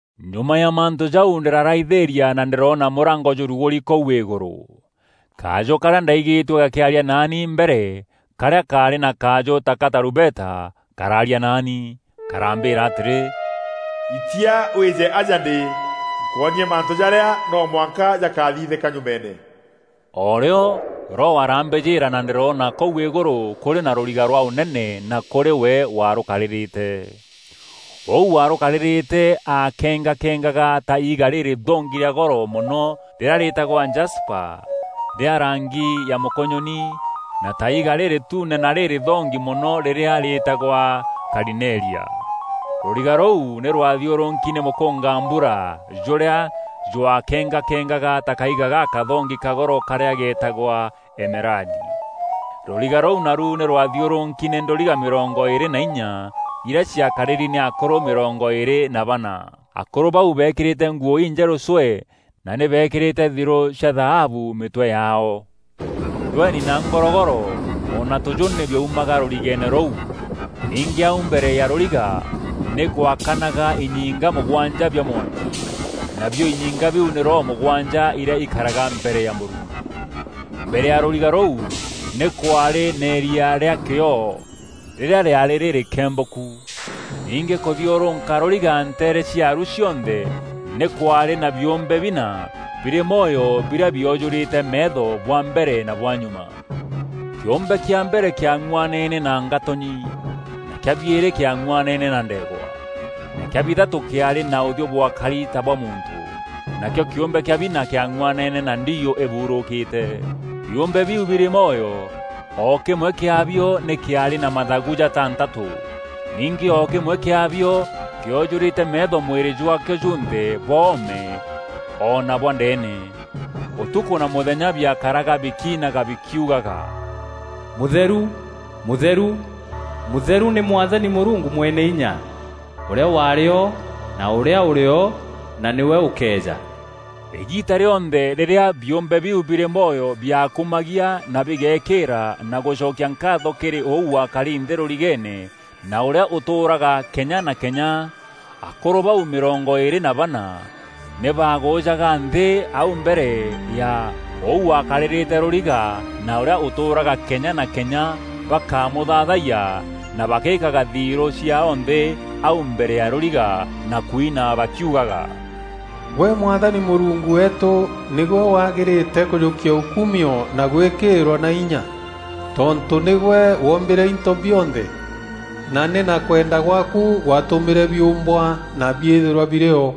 Nyuma ya mantû jau ndîraraithîîria na ndîroona mûrango jûrugûri kûu îgûrû. Kajû karîa ndaigîtue gakîaria naani mbere karîa kaarî na kajû ta ga tarumbeta, karaaria naani. Karambîîra atîrî, “Itia wîje aja ndî, nkwonie mantû jarîa no mwanka jakathithîka nyumeene.” O rîo Roho arambîjîîra na ndîrona kûu îgûrû kûrî na rûriga rwa ûnene na kûrî we warûkarîrîte. Ûu warûkarîrîte aakengakengaga ta iiga rîrîthongi rîa goro mono rîrîa rîtagwa jasipa rîa rangi ya mûkûnyûni na ta iiga rîrîtune na rîrîthongi mono rîrîa rîtagwa karineria. Rûriga rûu nî rwathiûrûki nî mûkûngambura jûrîa jwakengakengaga ta kaiga gakathongi ka goro karîa getagwa emeradi. Rûriga rûu naru nî rwathiûrûki nî ndûriga mîrongo îîrî na inya irîa ciakarîri nî akûrû mîrongo îîrî na bana. Akûrû bau beekîrîte nguû injerû cwee na nî beekîrîte thirû cia thaabu mîtwe yaao. Ndweni na ngorogoro o na tûjû nî biaumaga rûrigeene rûu. Ningî au mbere ya rûriga nî gwaakanaga inyinga mûgwanja bia mwanki, nabio inyinga biu nî Roho mûgwanja irîa ikaraga mbere ya Mûrungu. Mbere ya rûriga ruû, nî kwaarî na îria rîa kîoo rîrîa rîaarî rîrîkembûku. Ningî kûthiûrûka rûriga nteere ciaru cionthe nî kwaarî na biûmbe bina birî mwoyo birîa biojûrîte meetho bwa mbere na bwa nyuma. Kîûmbe kîa mbere kîang'uanene na ngatûnyi, na kîa biîrî kîang'uanene na ndeegwa, na kîa bithatû kîaarî na ûthiû bwakari ta bwa muntû, nakîo kîûmbe kîa bina kîang'uanene na ndiiû îbuurûkîte. Biûmbe biu birî mwoyo, o kîmwe kîabio nî kîaarî na mathagu jatantatû. Ningî o kîmwe kîabio kîojûrîte meetho mwîrî jwaakîo junthe bwa oome o na bwa ndeene. Ûtukû na mûthenya biakaraga bikiinaga bikiugaga, “Mûtheru, mûtheru, mûtheru nî Mwathani Mûrungu Mweneinya, ûrîa waarî o na ûrîa ûrî o na nîwe ûkeeja!” Îgiita rîonthe rîrîa biûmbe biu birî mwoyo biakumagia na bigeekîîra na gûcokia nkaatho kîrî ûu wakari nthî rûrigeene na ûrîa ûtûûraga kenya na kenya, akûrû bau mîrongo îîrî na bana nî baagûjaga nthî au mbere ya ûu wakarîrîte rûriga na ûrîa ûtûûraga kenya na kenya bakamûthaathayia na bagîkaga thirû ciaao nthî au mbere ya rûriga, na kwina bakiugaga, “Gwe Mwathani Mûrungu weetû nîgwe wagîrîte kûjûkia ûkumio na gwîkîîrwa na inya, tontû nîgwe woombîre into bionthe, na nî na kwenda gwaaku gwaatûmîre biûmbwa na biîthîrwa birîo.”